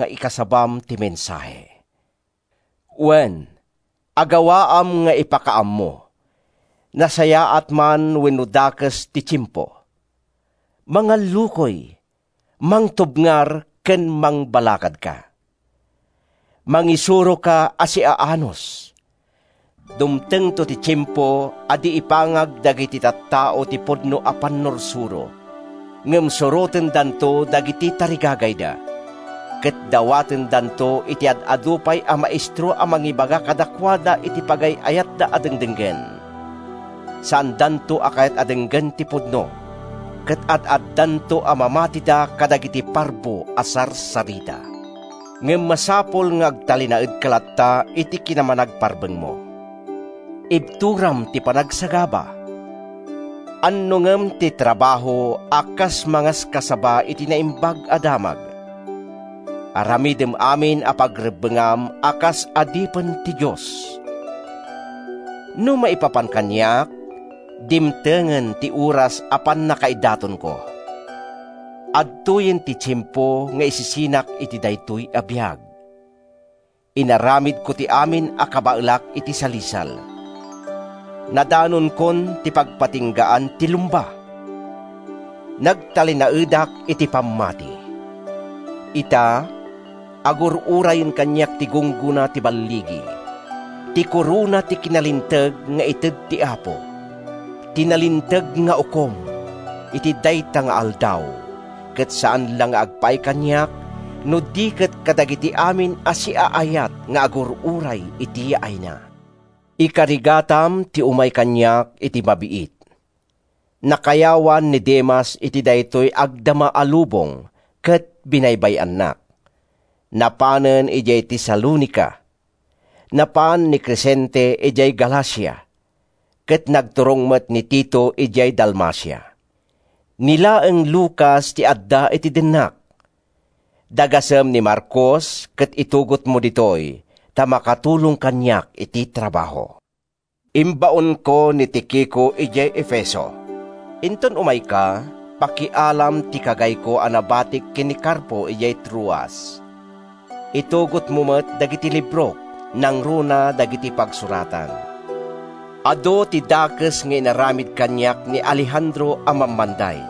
nga ikasabam ti mensahe. Wen, agawaam nga ipakaammo, nasayaat man wenno dakes ti tiempo. Mangallukoy, mangtubngar ken mangbalakadka. Mangisuroka a siaanus. Dumtengto ti tiempo a di ipangag dagiti tattao ti pudno a pannursuro, ngem surotendanto dagiti tarigagayda, ket dawatendanto iti ad-adu pay a maestro a mangibaga kadakuada iti pagay-ayatda a dengdenggen. Saandanto a kayat a denggen ti pudno, ket ad-addanto a mamatida kadagiti parbo a sarsarita. Ngem masapul nga agtalinaedka latta iti kinamanagparbengmo. Ibturam ti panagsagaba. Annongem ti trabaho a kas mangaskasaba iti Naimbag a Damag. Aramidem amin a pagrebbengam a kas adipen ti Dios. No maipapan kaniak, dimtengen ti oras a pannakaidatonko. Adtoyen ti tiempo nga isisinak iti daytoy a biag. Inaramidko ti amin a kabaelak iti salisal. Nadanonkon ti pagpatinggaan ti lumba. Nagtalinaedak iti pammati. Ita, agur-urayen kaniak ti gunggona ti balligi, ti korona ti kinalinteg nga ited ti Apo, ti nalinteg nga Ukom, iti dayta nga Aldaw—ket saan la nga agpaay kaniak no di ket kadagiti amin a siaayat nga agur-uray iti yaayna. Ikarigatam ti umay kaniak iti mabiit. Nakayawan ni Demas iti daytoy agdama a lubong ket binaybay-annak. Napanen idiay Tesalonica. Napan ni Cresente idiay Galacia ket nagturong met ni Tito idiay Dalmacia. Ni laeng Lucas ti adda iti dennak. Dagasem ni Marcos ket itugotmo ditoy, ta makatulong kaniak iti trabaho. Imbaonko ni Tikico idiay Efeso. Inton umayka, pakialam ti kagayko a nabatik ken ni Carpo idiay Troas. Itugotmo met dagiti librok, nangruna dagiti pagsuratan. Adu ti dakes nga inaramid kaniak ni Alejandro a mammanday.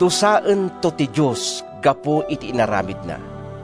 Dusaento ti Dios gapu iti inaramidna.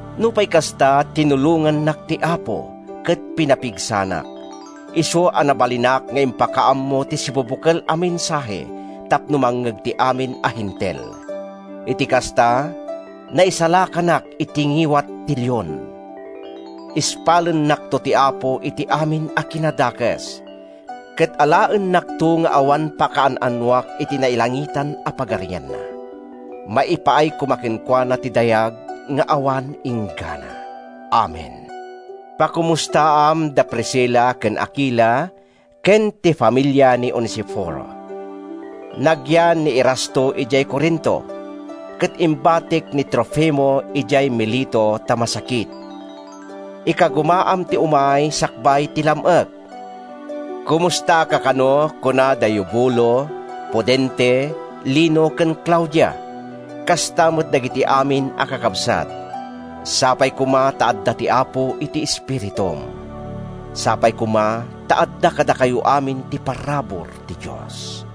Nupay kasta, tinulongannak ti Apo ket pinapigsanak, isu a nabalinak nga impakaammo ti sibubukel a mensahe tapno mangngeg ti amin a Hentil. Iti kasta, naisalakanak iti ngiwat ti leon. Ispalennakto ti Apo iti amin a kinadakes, ket alaennakto nga awan pakaan-anoak iti nailangitan a Pagarianna. Maipaay koma kenkuana ti dayag nga awan inggana! Amen. Pakomustaam da Priscila ken Akila ken ti familia ni Onesiforo. Nagyan ni Erasto idiay Corinto, ket imbatik ni Trofimo idiay Mileto ta masakit. Ikagumaam ti umay sakbay ti lam-ek. Komustaka kano, kuna da Eubulo, Pudente, Lino ken Claudia, kasta met dagiti amin a kakabsat. Sapay koma ta adda ti Apo iti espiritum. Sapay koma ta adda kadakayo amin ti parabur ti Dios.